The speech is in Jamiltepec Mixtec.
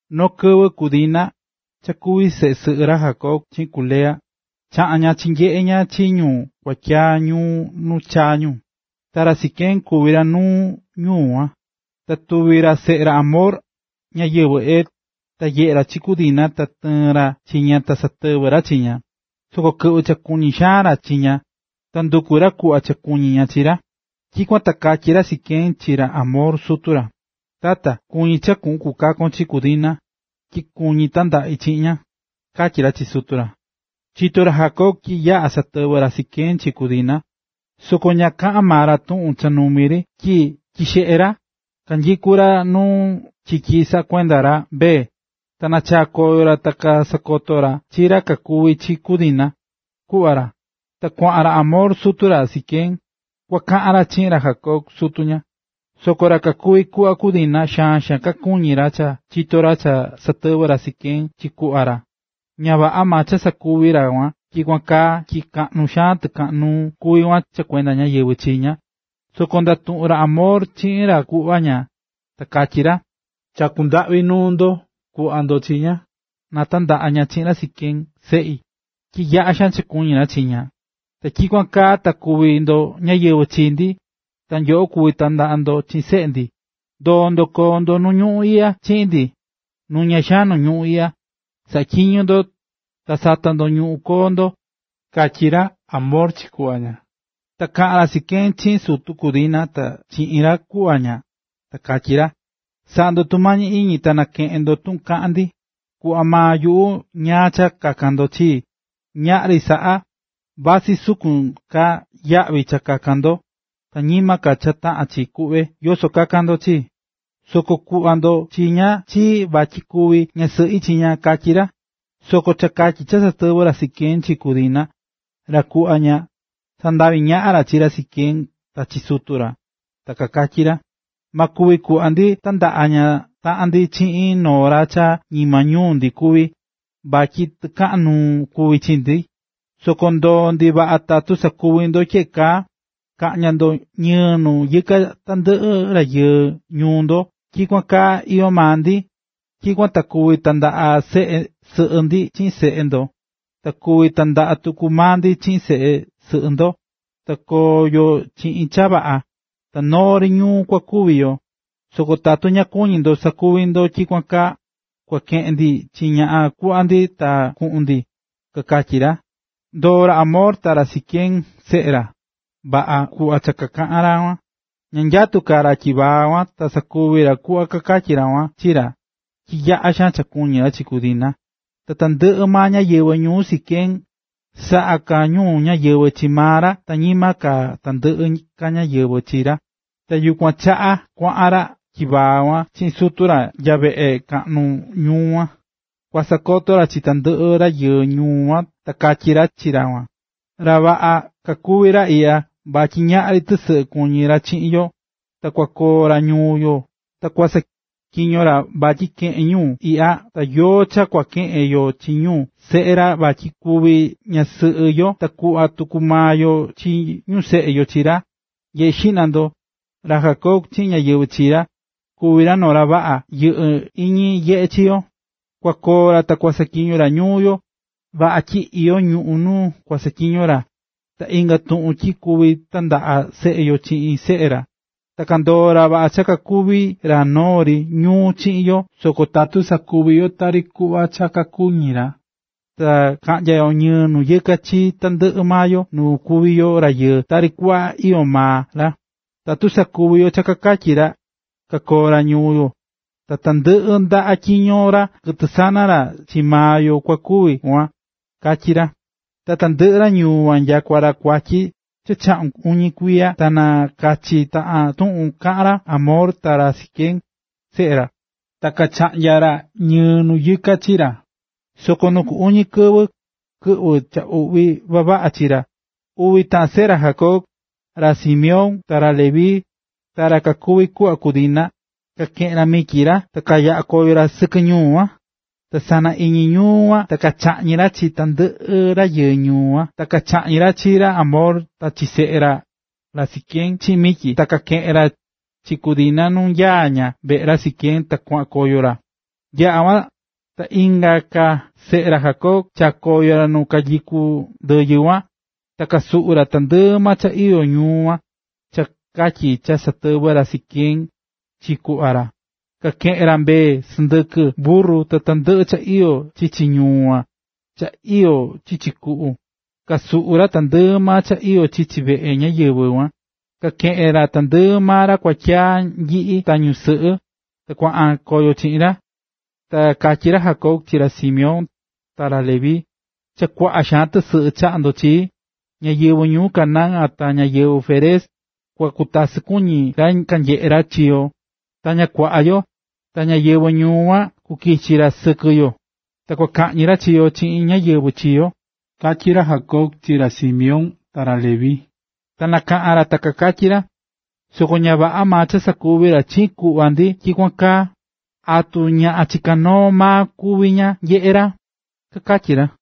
Noo kɨvɨ ku Dina, cha kuví seꞌe sɨꞌɨ ra Jacob chiꞌin ku Lea, chaꞌa̱n ña chinyeꞌe̱ ña chi ñu kuatyaa ñuu nu chaa̱ ñu. Ta ra Siquem kuví ra nuu ñuu kuan, ta kuví ra seꞌe ra Hamor, ñáyɨvɨ Hev. Ta nyeꞌe̱ ra chi ku Dina ta tɨɨ̱n ra chi ña ta satɨvɨ̱ ra chi ña. Soko kɨꞌvɨ̱ cha kuñí xaan ra chi ña ta nduku̱ ra kuꞌva cha kuñi ña chi ra. Tyikuan ta katyí ra Siquem chi ra Hamor, sutu ra: ―Tata, kuñí cha kuꞌun kukakon chi ku Dina, tyi kuñí tandaꞌi chiꞌin ña ―katyí ra chi sutu ra. Chito̱ ra Jacob tyi cha yaꞌa̱ satɨvɨ̱ ra Siquem chi ku Dina, soko ña kaꞌa̱n maa ra tuꞌun cha numi ri tyi seꞌe ra kanyikú ra nu chiki saꞌá kuenda ra mbee. Ta nachaa̱ koyo ra ta sakoto̱ ra chi ra cha kuvi̱ chi ku Dina, kuꞌva ra. Ta kuaꞌan ra Hamor, sutu ra Siquem, kua kaꞌan ra chiꞌin ra Jacob, sutu ña. Soko ra kakuví kuꞌva ku Dina xaan xaan kakuñí ra cha kachito̱ ra cha satɨvɨ̱ ra Siquem chi kuꞌva ra. Ña vaꞌa maa cha sakuvi̱ ra kuan tyikuan kaa tyi kaꞌnu xaan tɨkaꞌan nuu kuví kuan cha kuenda ñáyɨvɨ chii ña. Soko ndatuꞌu̱n ra Hamor chiꞌin ra kuꞌva ña, ta katyí ra: ―Chakú ndaꞌvi nuu ndo, ku̱ꞌva ndo chi ña, na tandaꞌa ña chiꞌin ra Siquem, seꞌi, tyi yaꞌa xaan cha kuñí ra chi ña. Ta tyikuan kaa ta kuvi ndo ñáyɨvɨ chi ndi, ta nyuꞌu kuvi tandaꞌa ndi chiꞌin seꞌe ndo ta nyoꞌo kuvi tandaꞌa ndo chiꞌin seꞌe ndi. Ndo̱o ndo koo ndo ñuu iꞌya chiꞌin ndi, nuña xaan nu ñuꞌún iꞌya, sa̱ꞌatyiño ndo ta sa̱ta ndo ñuꞌún koo ndo ―katyí ra Hamor chi kuꞌva ña. Ta kaꞌán ra Siquem chiꞌin sutu ku Dina ta chiꞌin ra kuꞌva ña, ta katyí ra: ―Sa̱ꞌa ndo tumañi iñi ta na keꞌen ndo tuꞌun kaꞌán ndi. Kuꞌva maa yuꞌu ñáá cha kakan ndo chii. Ñaꞌri saꞌa, vasɨ sukun ka yaꞌvi cha kakan ndo, ta ñima ka cha taꞌán chi, kuꞌve yoso kakan ndo chii, soko kuꞌva ndo chi ña chii vatyi kuvi ñasɨꞌi chi ña ―katyí ra. Soko cha katyi cha satɨvɨ̱ ra Siquem chi ku Dina, ra kuꞌva ña, kasandavi̱ ñaꞌan ra chi ra Siquem ta chi sutu ra. Ta kakatyí ra: ―Ma kuvi kuꞌva ndi tandaꞌa taꞌan ndi chiꞌin noo ra cha ñima ñuu ndi kuví, vatyi tɨkaꞌan nuu kuví chi ndi. Soko ndoo ndi vaꞌa tatu sakuvi ndo tyeꞌe kaa: ka̱ꞌnya ndo ñɨɨ nu yɨka tandɨꞌɨ rayɨɨ ñuu ndo tyi tyikuan kaa iyó maa ndi. Tyikuan ta kuvi tandaꞌa seꞌe sɨꞌɨ ndi chiꞌin seꞌe ndo, ta kuvi tandaꞌa tuku maa ndi chiꞌin seꞌe sɨꞌɨ ndo; ta koo yo chiꞌin cha vaꞌa, ta noo ri ñuu kua kuvi yo. Soko tatu ña kuñí ndo sakuvi ndo tyikuan kaa, kua keꞌen ndi chi ñaꞌan kuꞌva ndi ta kuꞌun ndi ―kakatyí ra. Ndoo̱ ra Hamor ta ra Siquem, seꞌe ra, vaꞌa kuꞌva kakaꞌa̱n ra kuan. Ña nyatú ka ra tyivaa kuan, ta sakuvi̱ ra kuꞌva kakatyí ra kuan chi ra, tyi yaꞌa xaan cha kuñí ra chi ku Dina. Ta tandɨꞌɨ ñáyɨvɨ ñuu ra Siquem saꞌá ka ñu ñáyɨvɨ chi maa ra ta ñima ka tandɨꞌɨ ka ñáyɨvɨ chi ra. Yukuan chaꞌa kuaꞌan ra tyivaa kuan chiꞌin sutu ra nya yuveꞌe kaꞌnu ñuu kuan, kua sakoto ra chi tandɨꞌɨ rayɨɨ ñuu kuan ta katyí ra chi ra kuan: ―Ra vaꞌa kakuví ra iꞌya vatyi ñaꞌri tɨsɨꞌɨ kuñí ra chiꞌin yo, ta kua koo ra ñuu yo ta kusaꞌatyiño ra vatyi keꞌen ñuꞌún iꞌya ta yoo kua keꞌen yo chi ñu seꞌe ra vatyi kuvi ñasɨꞌɨ yo ta kuꞌva tuku maa yo chi ñu seꞌe yo chi ra. Nye̱ꞌe xiꞌna ndo, ra Jacob chiꞌin ñáyɨvɨ chi ra, kuví ra noo ra vaꞌa yɨꞌɨ́ iñi nyeꞌe chi yo, kua koo ra ta kua saꞌatyiño ra ñuu yo. Vaꞌa tyi iyó ñuꞌún nu kua saꞌatyiño ra, ta inga tuꞌun tyi kuvi tandaꞌa seꞌe yo chiꞌin seꞌe ra. Ta kandoó ra vaꞌa cha kakuví ra noo ri ñuu chiꞌin yo soko tatu sakuví yo tari kuꞌva cha kakuñí ra, na taꞌnya ñɨɨ nu yɨka chi tandɨꞌɨ maa yoo nu kuví yo rayɨɨ tari kuꞌva ka iyó maa ra. Tatu sakuví yo cha kakatyí ra, kakoo ra ñuu yo, ta tandɨꞌɨ ndaꞌa tyiño ra ta kɨtɨ sana ra chii maa yo kua kuvi kuan ―katyí ra. Ta tandɨꞌɨ ra ñuu kuan nyakua nya ra kuatyi cha chaꞌun uñi kuiya ta na kachi taꞌan tuꞌun kaꞌa̱n ra Hamor ta ra Siquem, seꞌe ra, ta kachaꞌnya̱ ra ñɨɨ nu yɨka chi ra. Soko nu ku uñi kɨvɨ, kɨꞌvɨ cha uꞌvi vavaꞌa chi ra, uvi taꞌan seꞌe ra Jacob: ra Simeón ta ra Leví, ra kakuví kuꞌva ku Dina, kakeꞌe̱n ra mityi ra ta chaꞌa̱n koyo ra sɨkɨ ñuu kuan, ta sana iñi ñuu kuan ta kachaꞌñi̱ ra chi tandɨꞌɨ rayɨɨ ñuu kuan. Ta kachaꞌñi̱ ra chi ra Hamor ta chi seꞌe ra, ra Siquem, chiꞌin mityi, ta kakeꞌe̱n ra chi ku Dina nu nyaá ña veꞌe ra Siquem, ta kuaꞌan koyo ra. Yaꞌa̱ kuan, ta inga ka seꞌe ra Jacob, chaa̱ koyo ra nu kayukú ndɨyɨ kuan, ta kasuꞌu̱ ra tandɨꞌɨ maa cha iyó ñuu kuan, cha katyi cha satɨvɨ̱ ra Siquem chi kuꞌva ra. Kakeꞌe̱n ra mbee, sɨndɨkɨ, burru, ta tandɨꞌɨ cha iyó chichi ñuu kuan ta cha iyó chichi kuꞌu. Kasuꞌu̱ ra tandɨꞌɨ maa cha iyó chichi veꞌe ñáyɨvɨ kuan, kakeꞌe̱n ra tandɨꞌɨ maa ra kuatyaa nyiꞌi ta ñusɨꞌɨ, ta kuaꞌan koyo chiꞌin ra. Ta katyí ra Jacob chi ra Simeón ta ra Leví: ―Cha kuaꞌa xaan tɨsɨꞌɨ chaꞌa̱ ndo chii. Ñáyɨvɨ ñuu Canaán ta ñáyɨvɨ Férez, kua kutasɨ kuñi ra kanyeꞌé ra chi yo. Ta ña kuaꞌa yo, ta ñáyɨvɨ ñuu kuan kukichi ra sɨkɨ yo, ta kua kaꞌñi ra chi yo chiꞌin ñáyɨvɨ chi yo ―katyí ra Jacob chi ra Simeón ta ra Leví. Ta kanakaꞌa̱n ra ta kakatyí ra: ―Soko ña vaꞌa maa cha sakuvi̱ ra chiꞌin kuꞌva ndi tyikuan kaa, ¿atu ñaꞌan chiká noo maa kuví ña, nyeꞌé ra? ―kakatyí ra.